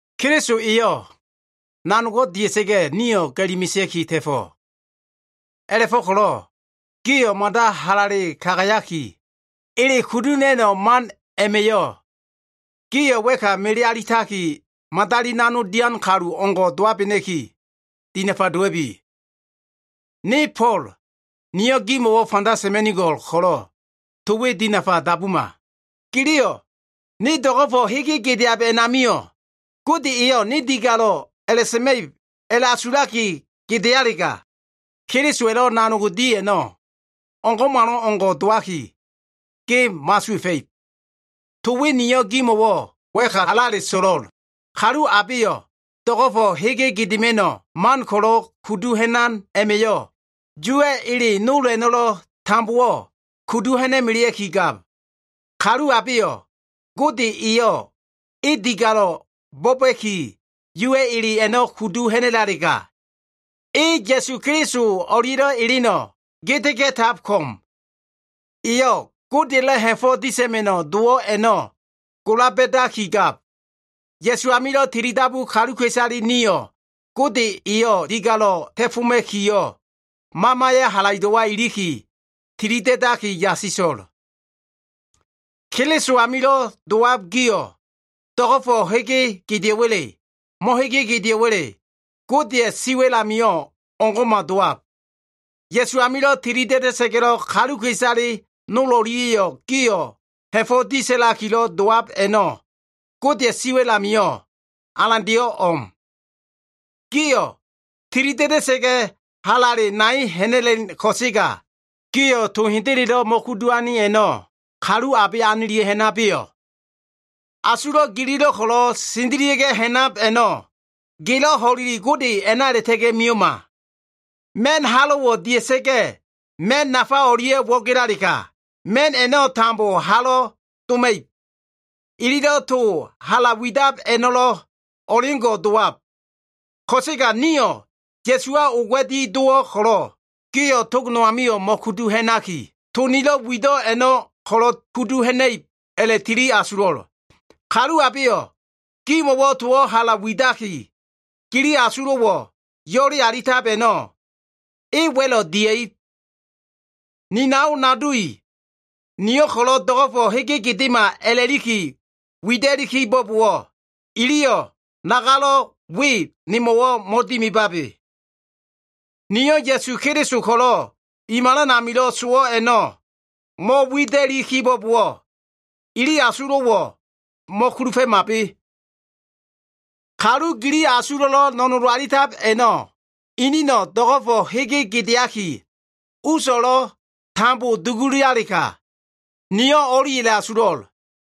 Keliso eyo꞉ nanogo꞉ dia꞉sa꞉ga꞉, nio꞉ ga꞉li mesea꞉ki ta꞉fo꞉. A꞉la꞉fo꞉ko꞉lo꞉ gio꞉ mada halale kagayaki, ele kudu ha꞉na꞉no꞉ man a꞉ma꞉yo꞉ gio꞉ wa꞉ka mele alitaki, madali nanog dian kalu o꞉ngo꞉ dowabena꞉ki, dinafa dowa꞉bi. Ne Fo꞉l, niyo꞉ gimo꞉wo꞉ fanda sa꞉ma꞉nigo꞉l ko꞉lo꞉, to we dinafa dabuma! Giliyo꞉ “ne do꞉go꞉fo꞉ hege gedeab a꞉namio꞉ Gode eyo꞉ ne digalo꞉ sa꞉ma꞉ib,” a꞉la꞉asulaki gedealega, Kelisowa꞉lo꞉ nanog di a꞉no꞉ o꞉ngo꞉malo꞉ngo꞉ dowaki, ge mo꞉asuwa꞉fa꞉ib. To we niyo꞉ gimo꞉wo꞉ wa꞉ka halale a꞉so꞉lo꞉l. Kalu abeyo꞉ do꞉go꞉fo꞉ hege gedema꞉no꞉ man ko꞉lo꞉ kudu ha꞉nab a꞉ma꞉yo꞉, Yuwa꞉ ele nol a꞉no꞉lo꞉ tambowo꞉ kudu ha꞉na꞉melea꞉ki gab. Kalu abeyo꞉ Gode eyo꞉ e digalo꞉ a꞉la꞉bo꞉ba꞉ki, Yuwa꞉ ele a꞉no꞉ kudu ha꞉na꞉lalega, e Ya꞉su Keliso o꞉lia꞉lo꞉ eleno꞉ gedega꞉tab ko꞉m. Eyo꞉ Godeya꞉lo꞉ ha꞉fo꞉ disa꞉ma꞉no꞉ dowo꞉ a꞉no꞉ gola ba꞉dakigab. Ya꞉su amilo꞉ tilidabu kaluka꞉isale nio꞉ Gode eyo꞉ digalo꞉ ta꞉foma꞉kiyo꞉, Mamaya꞉ halaido꞉wa iliki, tilida꞉da꞉li yasiso꞉l. Keliso amilo꞉ dowab gio꞉, do꞉go꞉fo꞉ hege gedeo꞉wa꞉le, mo꞉gedeo꞉wa꞉le, Godeya꞉ siwa꞉l amio꞉ o꞉ngo꞉ma dowab. Ya꞉su amilo꞉ tilida꞉da꞉sa꞉ga꞉lo꞉, kaluka꞉isale nol o꞉lia꞉yo꞉ gio꞉ ha꞉fo꞉ disa꞉lakilo꞉ dowab a꞉no꞉ Godeya꞉ siwa꞉l amio꞉ alandeyo꞉ o꞉m. Gio꞉ tilida꞉da꞉sa꞉ga꞉, halale nai ha꞉na꞉len ko꞉sega, gio꞉ to hendelelo꞉ mo꞉kudu ane a꞉no꞉ kalu abe anilia꞉ ha꞉nabeyo꞉? Asulo꞉ gililo꞉ ko꞉lo꞉ sendelia꞉ ha꞉nab a꞉no꞉, gelo꞉ ho꞉leli Gode a꞉na a꞉la꞉ta꞉ga꞉ mio꞉ma. Ma꞉n halo꞉wo꞉ dia꞉sa꞉ga꞉ ma꞉n nafa o꞉lia꞉ wo꞉gelalega, ma꞉n a꞉no꞉ tambo halo꞉ doma꞉ib. Ililo꞉ to hala widab a꞉no꞉lo꞉ o꞉leo꞉ngo꞉ dowab. Ko꞉sega nio꞉ Ya꞉suwa oga꞉di dowo꞉ ko꞉lo꞉, gio꞉ tog no amio꞉ mo꞉kudu ha꞉naki, to nilo꞉ wido꞉ a꞉no꞉ ko꞉lo꞉ kudu ha꞉na꞉ib a꞉la꞉tili asulo꞉l. Kalu abeyo꞉ gimo꞉wo꞉ towo꞉ hala widaki, gili asulo꞉wo꞉ yo꞉le alitab a꞉no꞉, e wa꞉lo꞉ dia꞉ib. Ni nao nado i, niyo꞉ ko꞉lo꞉ do꞉go꞉fo꞉ hege gedema a꞉la꞉liki wida꞉li kibo꞉bowo꞉, iliyo꞉ nagalo꞉ we nemo꞉lo꞉ mo꞉dimibabe. Niyo꞉ Ya꞉su Keliso ko꞉lo꞉ i malan amilo꞉ sowo꞉ a꞉no꞉ mo꞉wida꞉li kibo꞉bowo꞉, ili asulo꞉wo꞉ mo꞉kulufa꞉mabe. Kalu gili asulo꞉lo꞉ no꞉nolo꞉ alitab a꞉no꞉, inino꞉ do꞉go꞉fo꞉ hege gedeakiyo꞉, uso꞉lo꞉ tambo dugulalega, niyo꞉ o꞉li a꞉la꞉asulo꞉l.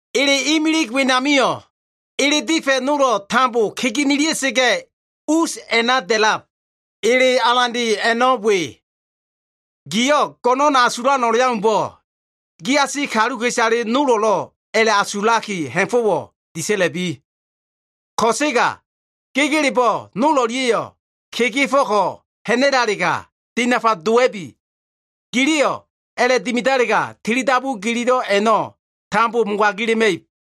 Ele imilig wenamio꞉, ele difa꞉ nolo꞉ tambo kegenelia꞉sa꞉ga꞉, us a꞉na da꞉lab. Ele alande a꞉no꞉ we “Gio꞉ go꞉no꞉n asulan o꞉leaumbo꞉, giasi kaluka꞉isale nolo꞉lo꞉ a꞉la꞉asulaki ha꞉fo꞉wo꞉ disa꞉la꞉bi.” Ko꞉sega gegelebo꞉ nol o꞉lia꞉yo꞉ kegefo꞉ko꞉ ha꞉na꞉lalega, dinafa dowa꞉bi! Giliyo꞉ a꞉la꞉dimidalega, tilidabu gililo꞉ a꞉no꞉ tambo mogagila꞉ma꞉ib.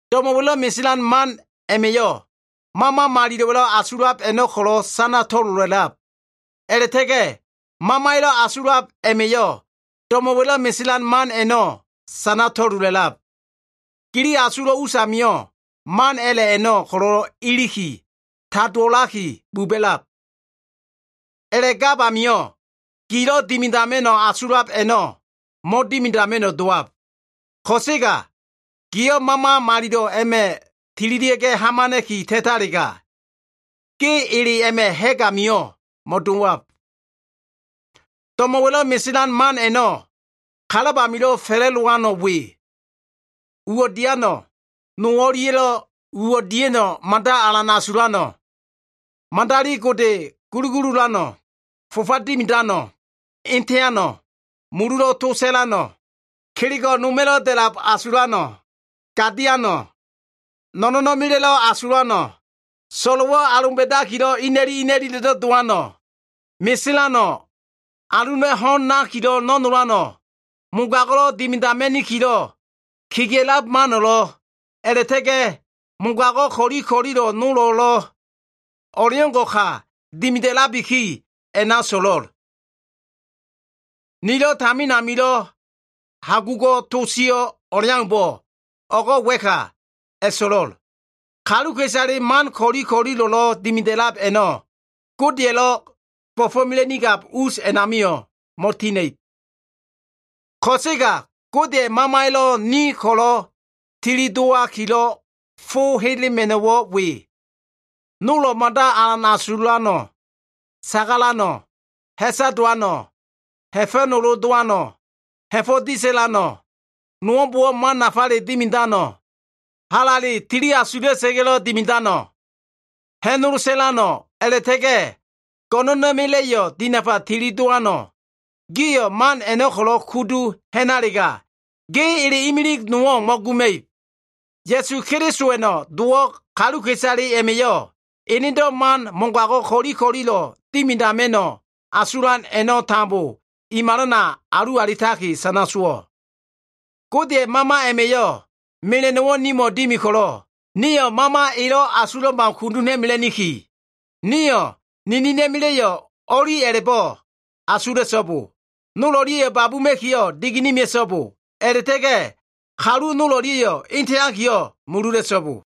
Do꞉mo꞉wa꞉lo꞉ meselan man a꞉ma꞉yo꞉, Mama Malilo꞉wa꞉lo꞉ asulab a꞉no꞉ ko꞉lo꞉ sana to꞉lola꞉lab. A꞉la꞉ta꞉ga꞉ Mamaya꞉lo꞉ asulab a꞉ma꞉yo꞉ do꞉mo꞉wa꞉lo꞉ meselan man a꞉no꞉ sana to꞉lola꞉lab. Gili asulo꞉ usamio꞉ man a꞉la꞉ a꞉no꞉ ko꞉lo꞉ iliki, tadowo꞉laki buba꞉lab. A꞉la꞉gab amio꞉, gilo꞉ dimidama꞉no꞉ asulab a꞉no꞉ mo꞉dimidama꞉no꞉ dowab. Ko꞉sega gio꞉ Mama malilo꞉ a꞉ma꞉ tililia꞉ hamana꞉ki ta꞉talega, ge ele a꞉ma꞉ ha꞉g amio꞉ mo꞉dowab. Do꞉mo꞉wa꞉lo꞉ meselan man a꞉no꞉, kalab amilo꞉ fa꞉la꞉dowano꞉ we. Uwo꞉ diano꞉, no o꞉lia꞉lo꞉ uwo꞉ dia꞉no꞉ mada alan asulano꞉, madali gode gulugululano꞉, fofa dimidano꞉, eteano꞉, mululo꞉ to sa꞉lano꞉, kelego꞉ noma꞉lo꞉ da꞉lab asulano꞉, gadiano꞉, no꞉no꞉na꞉ma꞉la꞉ asulano꞉, so꞉lo꞉wo꞉ aloba꞉dakilo꞉ ina꞉li ina꞉li a꞉la꞉do꞉ dowano꞉, meselano꞉, aluna꞉ ho꞉n nakilo꞉ no꞉nolano꞉, mogago꞉lo꞉ dimidama꞉nikilo꞉ kegea꞉lab mano꞉lo꞉, a꞉la꞉ta꞉ga꞉ mogago꞉ ko꞉li ko꞉lilo꞉ nol a꞉no꞉lo꞉ o꞉leo꞉ngo꞉ka dimida꞉labiki a꞉na so꞉lo꞉l. Nilo꞉ tamin amilo꞉ hagugo꞉ to sio꞉ o꞉leaumbo꞉, o꞉go꞉ wa꞉ka a꞉so꞉lo꞉l. Kaluka꞉isale man ko꞉li ko꞉lilo꞉lo꞉ dimida꞉lab a꞉no꞉, Godeya꞉lo꞉ bo꞉fo꞉mela꞉nigab us a꞉namio꞉ mo꞉tina꞉ib. Ko꞉sega Godeya꞉ Mamaya꞉lo꞉ nio꞉ ko꞉lo꞉ tili dowakilo꞉ fo helema꞉no꞉wo꞉ we. Nolo꞉ mada alan asulano꞉, sagalano꞉, ha꞉sa dowano꞉, ha꞉fa꞉nolo dowano꞉, ha꞉fo꞉ disa꞉lano꞉, nolbo꞉wo꞉ man nafale dimidano꞉, halale tili asula꞉sa꞉ga꞉lo꞉ dimidano꞉, ha꞉nolo sa꞉lano꞉, a꞉la꞉ta꞉ga꞉ go꞉no꞉na꞉ma꞉la꞉yo꞉ dinafa tili dowano꞉. Gio꞉ man a꞉no꞉ ko꞉lo꞉ kudu ha꞉nalega, ge ele imilig no꞉wo꞉ mo꞉guma꞉ib. Ya꞉su Kelisowa꞉no꞉ dowo꞉ kaluka꞉isale a꞉ma꞉yo꞉, enedo꞉ man mogago꞉ ko꞉li ko꞉lilo꞉ dimidama꞉no꞉ asulan a꞉no꞉ tambo i malana alu alitaki, sana sowo꞉. Godeya꞉ Mama a꞉ma꞉yo꞉ mela꞉no꞉wo꞉ nimo꞉ dimi ko꞉lo꞉, nio꞉ Mama elo꞉ asulab au kudu ha꞉na꞉mela꞉niki. Nio꞉ ninina꞉ma꞉la꞉yo꞉ o꞉li a꞉la꞉bo꞉ asula꞉so꞉bo. Nol o꞉lia꞉yo꞉ babuma꞉kiyo꞉ digene mea꞉so꞉bo. A꞉la꞉ta꞉ga꞉ kalu nol o꞉lia꞉ eteakiyo꞉ mulula꞉so꞉bo.